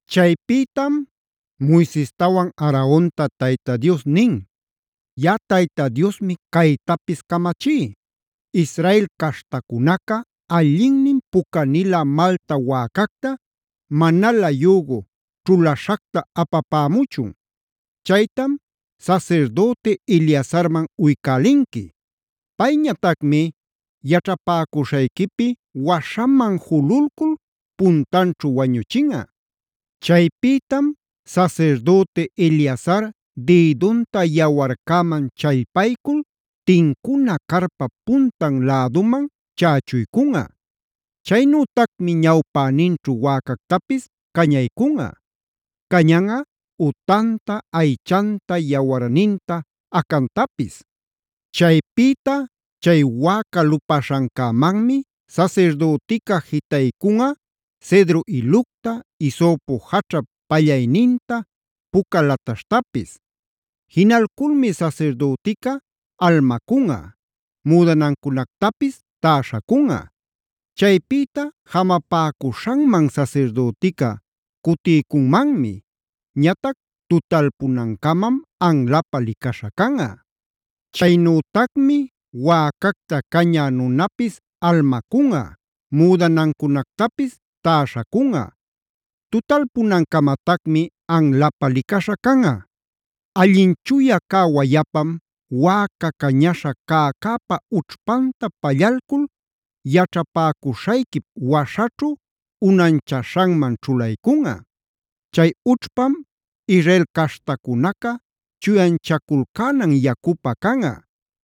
Chaypïtam Moisestawan Aaronta Tayta Dios nin: “Yaꞌa Tayta Diosmi caytapis camachí: Israel caśhtacunaca allinnin pucanilä malta wäcacta, manalä yügu ćhulaśhacta apapämuchun. Chaytam sasirdüti Eleazarman uycälinqui. Payñatacmi yaćhapäcuśhayquipi waśhaman jululcul puntanćhu wañuchinꞌa. Chaypïtam sasirdüti Eleazar dïdunta yawarcäman challpaycul tincuna carpap puntan läduman chächuycunꞌa. Chaynütacmi ñawpäninćhu wäcactapis cañaycunꞌa. Cañanꞌa utanta, aychanta, yawarninta, acantapis. Chaypïta chay wäca lupaśhancämanmi sasirdütica jitaycunꞌa cedro ilucta, hisopo jaćhap pallayninta, puca lataśhtapis. Jinalculmi sasirdütica almacunꞌam; müdanancunactapis täśhacunꞌa. Chaypïta jamapäcuśhanman sasirdütica cutiycunmanmi; ñatac tutalpunancamam anlapä licaśha canꞌa. Chaynütacmi wäcacta caña nunapis almacunꞌa, müdanancunactapis täśhacunꞌa. Tutalpunancamatacmi anlapä licaśha canꞌa. “Allin chuya cä wayapam wäca cañaśha cäcäpa ućhpanta pallalcul yaćhapäcuśhayquip waśhaćhu unanchaśhanman ćhulaycunꞌa. Chay ućhpam Israel caśhtacunaca chuyanchaculcänan yacupä canꞌa.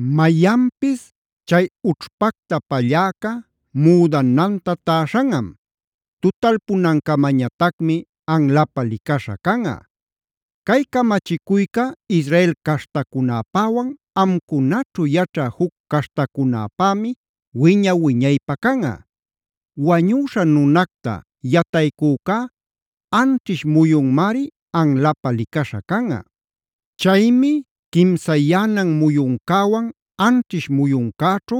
Mayanpis chay ućhpacta palläca müdananta täśhanꞌam. Tutalpunancamañatacmi anlapä licaśha canꞌa. Cay camachicuyca Israel caśhtacunäpäwan amcunaćhu yaćhä juc caśhtacunäpämi wiña-wiñaypä canꞌa. “Wañüśha nunacta yataycücá anćhish muyunmari anlapä licaśha canꞌa. Chaymi quimsayänan muyuncäwan anćhish muyuncäćhu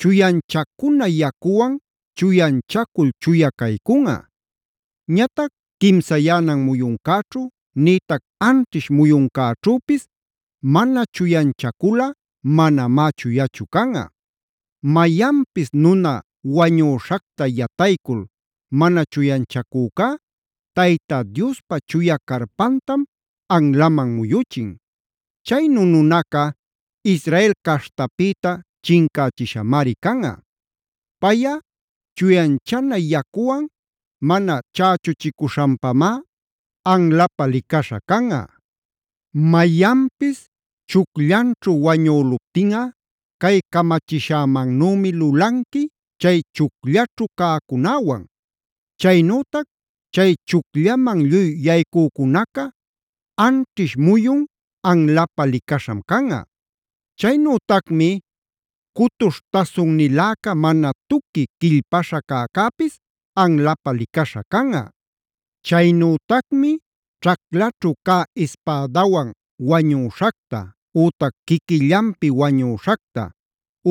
chuyanchacuna yacuwan chuyanchacul chuya caycunꞌa. Ñatac quimsayänan muyuncäćhu nïtac anćhish muyuncäćhüpis mana chuyanchaculꞌa manamá chuyachu canꞌa. Mayanpis nuna wañüśhacta yataycul mana chuyanchacücá Tayta Diospa chuya carpantam anlaman muyuchin. Chaynu nunaca Israel caśhtapïta chincachishamari canꞌa. Payꞌa chuyanchana yacuwan mana chächuchicuśhanpamá anlapä licaśha canꞌa. “Mayanpis chucllanćhu wañüluptinꞌa cay camachishämannümi lulanqui chay chucllaćhu cäcunäwan; chaynütac chay chucllaman lluy yaycücunaca anćhish muyun anlapä licaśham canꞌa. Chaynütacmi cutuśh tasunniläca mana tuqui quillpaśha cäcäpis anlapä licaśha canꞌa. “Chaynütacmi ćhaclaćhu cä ispädawan wañüśhacta, ütac quiquillanpi wañüśhacta,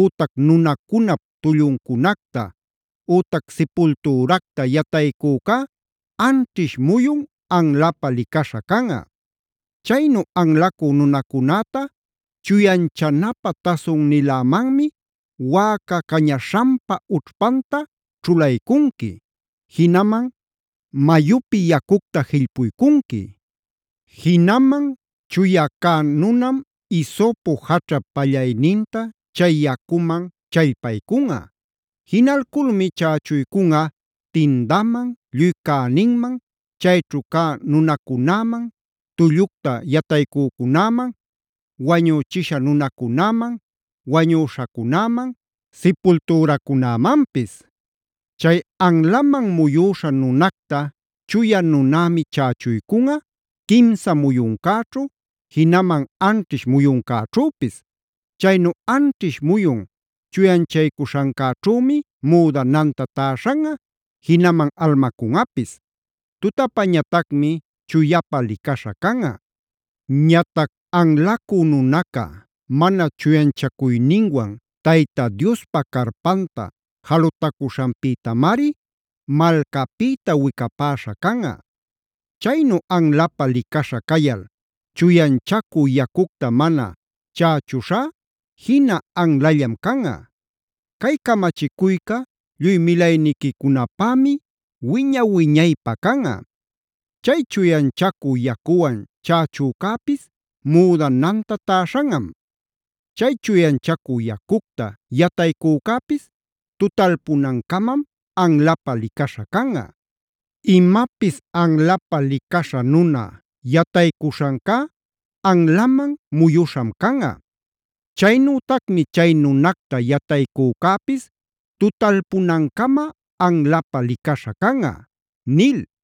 ütac nunacunap tulluncunacta, ütac sipultüracta yataycücá anćhish muyun anlapä licaśha canꞌa. “Chaynu anlacü nunacunäta chuyanchanapä tasunnilämanmi wäca cañaśhanpa ućhpanta ćhulaycunqui; jinaman mayupi yacucta jillpuycunqui. Jinaman chuya cä nunam hisopo jaćhap pallayninta chay yacuman challpaycunꞌa. Jinalculmi chächuycunꞌa tindaman, lluy cäninman, chayćhu cä nunacunäman, tullucta yataycücunäman, wañüchisha nunacunäman, wañüśhacunäman, sipultüracunämanpis. Chay anlaman muyüśha nunacta chuya nunämi chächuycunꞌa quimsa muyuncäćhu, jinaman anćhish muyuncäćhüpis. Chaynu anćhish muyun chuyanchacuśhancäćhümi müdananta täśhanꞌa, jinaman almacunꞌapis. Tutapañatacmi chuyapä licaśha canꞌa. Ñatac anlacü nunaca mana chuyanchacuyninwan Tayta Diospa carpanta jalutacuśhanpïtamari malcapïta wicapäśha canꞌa. Chaynu anlapä licaśha cayal chuyanchacü yacucta mana chächuśhá jina anlallam canꞌa. Cay camachicuyca lluy milayniquicunapämi wiña-wiñaypä canꞌa. Chay chuyanchacü yacuwan chächücäpis müdananta täśhanꞌam. Chay chuyanchacü yacucta yataycücäpis tutalpunancamam anlapä licaśha canꞌa. Imapis anlapä licaśha nuna yataycuśhancá anlaman muyuśham canꞌa. Chaynütacmi chay nunacta yataycücäpis tutalpunancama anlapä licaśha canꞌa” nil.